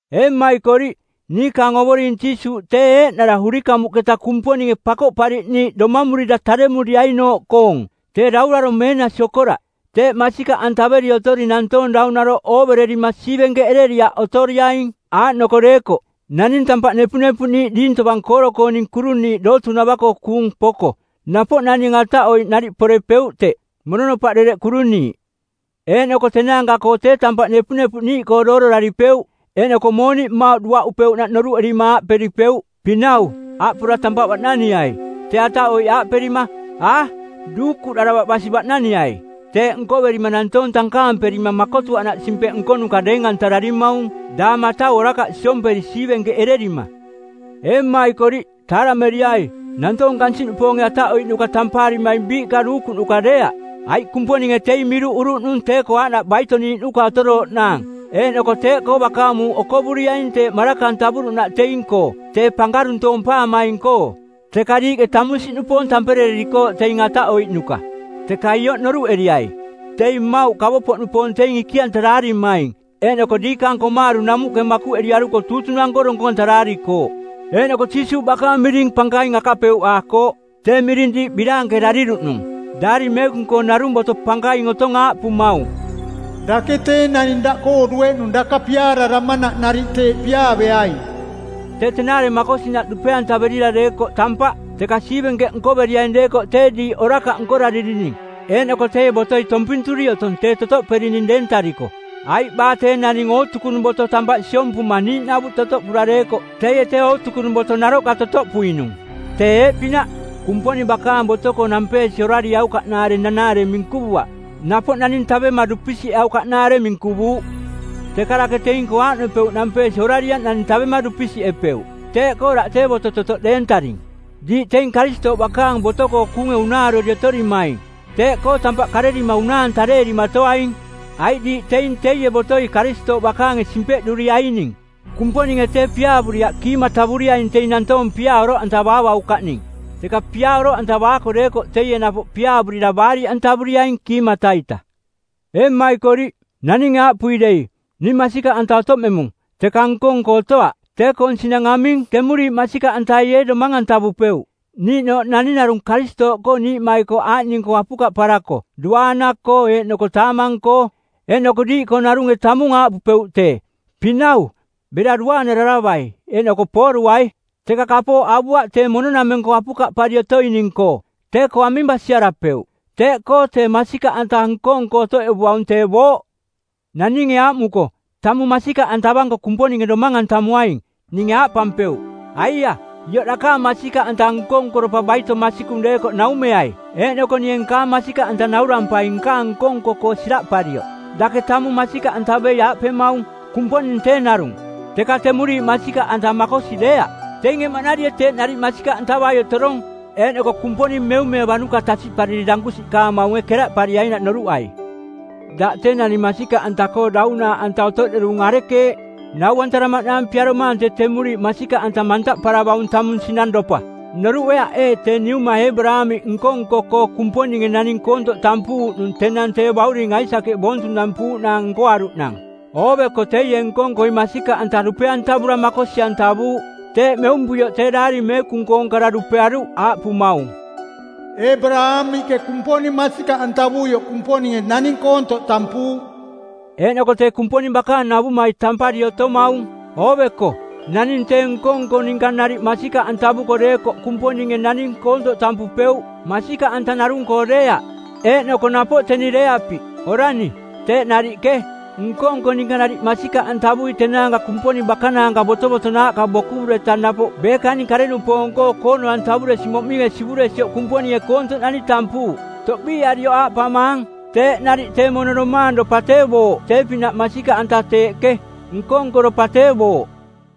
Ee mmaikoriꞌ, niikaang Ovoring Jiisuuꞌ tee eeꞌnara urikamuꞌketa Kumponinge Pakoꞌpariꞌniiꞌ domamurira taremuriainooꞌkoong, tee daurarong˜ meenasi okoraꞌ. Teeꞌ masikaꞌantaveri otori nantoong daunaroꞌ oovererima siivenkeꞌereriaꞌ otoriaing. Aaꞌnoko deekoꞌ, naning tampaꞌ nepunepuꞌniiꞌ diing tovang kooro-kooning kuruniiꞌ dootuuꞌnava-koo kuung poko, napoꞌ naning ataꞌoiꞌ nariꞌ porepeuꞌ teꞌ, mononopaꞌ dereꞌ kuruniiꞌ. Eeꞌnoko tenaanka-koo tee tampaꞌ nepunepuꞌniiꞌkoo doororaripeuꞌ eeꞌnoko mooniꞌ mmauꞌ duaꞌupeuꞌnaꞌ noruꞌerima aaꞌperipeuꞌ, “Pinau, aaꞌ pora tampaꞌ baꞌnaniai,” tee ataꞌoiꞌ aaꞌperima, “A, duukuꞌdaravaꞌ basi baꞌnaniai.” Teeꞌ nkoverima nantoong tankaamperima makotuaꞌnaꞌ simpeꞌ nkonuka˜ deeng-antararimaung daang matau orakaꞌ siomperi siivenkeꞌererima. Ee mmaikoriꞌ, taarameriai, nantoong kansiꞌnupoonge ataꞌoiꞌnuka tampaarimaing biiꞌka duukuꞌnuka deeaꞌ, aiꞌ Kumponinge teing miruꞌuruꞌnung tee-koo aaꞌnaꞌ baito-niiꞌnuka otorooꞌnaang eeꞌnoko teeꞌkoo bakaang muuꞌ okovuriaing teeꞌ maraka-antavuruꞌnaꞌ teing-koo tee pankaruntoompaamaing-koo. Teka diiꞌke tamunsiꞌnupoong tamperererikooꞌ teing ataꞌoiꞌnuka. Teka ioꞌ noruꞌeriai, teing mmauꞌ kavopoꞌnupoong teing ikiꞌantaraarimaing eeꞌnoko diikaang komaaru˜ namuꞌke makuꞌeriaruko tuutunang˜koo donkong-antaraarikooꞌ. Eeꞌnoko Jiisuuꞌ bakaang miring pankaing akapeuꞌaakooꞌ, tee miring diiꞌ biraankerariruꞌnung. Daari Meekung-koo narung boto pankaing otong aaꞌpumaung, “Dake tee naning daꞌkoo dueꞌnung daka piaararamanaꞌ nariꞌ teeꞌ piaaveaing.” Tee tenaare makosinaꞌ dupe-antaverira deekoꞌ tampaꞌ. Teka siivenkeꞌ nkoveriaing deekoꞌ tee diiꞌ orakaꞌ nkoraririning eeꞌnoko teie botoi tompinturi otong tee totoꞌperining deentariko. Aiꞌ baa tee naning ootukunung boto tampaꞌ siompuma niiꞌnavuꞌ totoꞌpura deekoꞌ teie tee ootukunung boto naroꞌka totoꞌpuinung. Tee eeꞌpinaꞌ, Kumponing bakaang boto-koo nampeesi orarieaukaꞌnaare nanaare minkuvuaꞌ, napoꞌ naning tavema dupisiꞌeaukaꞌnaare minkuvuuꞌ. Teka dake teing-koo aaꞌnopeuꞌ nampeesi orarieaꞌ naning tavema dupisiꞌepeuꞌ, teeꞌkoo daꞌ tee boto totoꞌ deentaring. Diiꞌ teing Karistooꞌ bakaang boto-koo kuunge unaarori otorimaing, teeꞌkoo tampaꞌ karerima unaa-antareerimatoaing, aiꞌ diiꞌ teing teie botoi Karistooꞌ bakaange simpeꞌruriaining. Kumponinge tee piaavuriaꞌ kiimatavuriaing teing nantoong piaa oroꞌantavaavaukaꞌning. Teka piaa oroꞌantavaako deekoꞌ teie napoꞌ piaavurira baariꞌantavuriaing kiimata-ita. Ee mmaikoriꞌ, naninge aaꞌpui dei, “Ning masikaꞌanta otoꞌmemung,” teka nko-nko otoaꞌ, tee-koong sinang aming? Temuriiꞌ masikaꞌantai ee domang-antavupeuꞌ? Niiꞌnooꞌ naning narung Karistooꞌkoo niiꞌmaikoꞌ aaꞌning-koo apukaꞌparako duaana-koo eeꞌnoko taamang-koo, eeꞌnoko diiꞌkoo narunge tamung aaꞌpupeuꞌ tee, “Pinau, bera duaanararavai eeꞌnoko pooruai,” teka kapooꞌ avuaꞌ tee mono-nameng-koo apukaꞌpari otoining-koo, tee-koo aming basiarapeuꞌ? Teeꞌkoo tee masikaꞌanta nko-nko otoꞌevuaung tee booꞌ. Naninge aaꞌmuko “Tamung masikaꞌantavanko Kumponinge domang-antamuaing,” ninge aaꞌpampeuꞌ, “Aiaꞌ ioꞌ dakaang masikaꞌanta nko-nkoropa baito masikung deekoꞌ naumeai, eeꞌnoko ninge nkaang masikaꞌanta naurampai nkaang nko-nko-koo siraꞌparioꞌ.” Dake tamung masikaꞌantavei aaꞌpemaung, “Kumponing tee narung,” teka temuriiꞌ masikaꞌanta makosi deeaꞌ. Teinge maꞌnarie teeꞌ nariꞌ masikaꞌantavai otorong, eeꞌnoko Kumponing meumeevanuka tasiꞌpariri dankusiꞌkaamaunge keraꞌpariainaꞌ noruꞌai. Daꞌ tee naning masikaꞌanta-koo daunaaꞌanta otoꞌderung arekeeꞌ, nau-antaramaꞌnaang piaromaang tee temuriiꞌ masikaꞌanta mantaꞌparavaung tamung sinangropa? Noruꞌeaꞌ ee tee niuma Eebaraamiꞌ nko-nko-koo Kumponinge naning koontoꞌ tampuuꞌnung tenang tee bauring Aisakeꞌ boontunampuuꞌnaang nkoaruꞌnang? Ooveko teie nko-nkoi masikaꞌanta dupe-antavura makosi-antavuuꞌ. Teeꞌ meumpuioꞌ tee Daari Meekung-koong kara dupearuꞌ aaꞌpumaung, “Eebaraamiꞌke Kumponing masikaꞌantavuioꞌ Kumponinge naning koontoꞌ tampuuꞌ.” Eeꞌnoko tee Kumponing bakaang navumai tampari otomaung. Ooveko, naning tee nko-nko ninka nariꞌ masikaꞌantavuko deekoꞌ Kumponinge naning koontoꞌ tampupeuꞌ, masikaꞌanta narung-koo deeaꞌ. Eeꞌnoko napoꞌ teni Reeapi, orani, teeꞌ nariꞌke, nko-nko ninka nariꞌ masikaꞌantavui tenaanka Kumponing bakanaanka botovotonaaꞌka bokuvureta napoꞌ beekaning kare-nupoong-koo koono-antavuresi moꞌminge sivuresioꞌ Kumponinge koontoꞌnani tampuuꞌ. Toꞌbiiarioꞌ aaꞌpamaang, teeꞌ nariꞌ tee mono domaangropa tee booꞌ tee-pinaꞌ masikaꞌanta teeꞌke, nko-nkoropa tee booꞌ.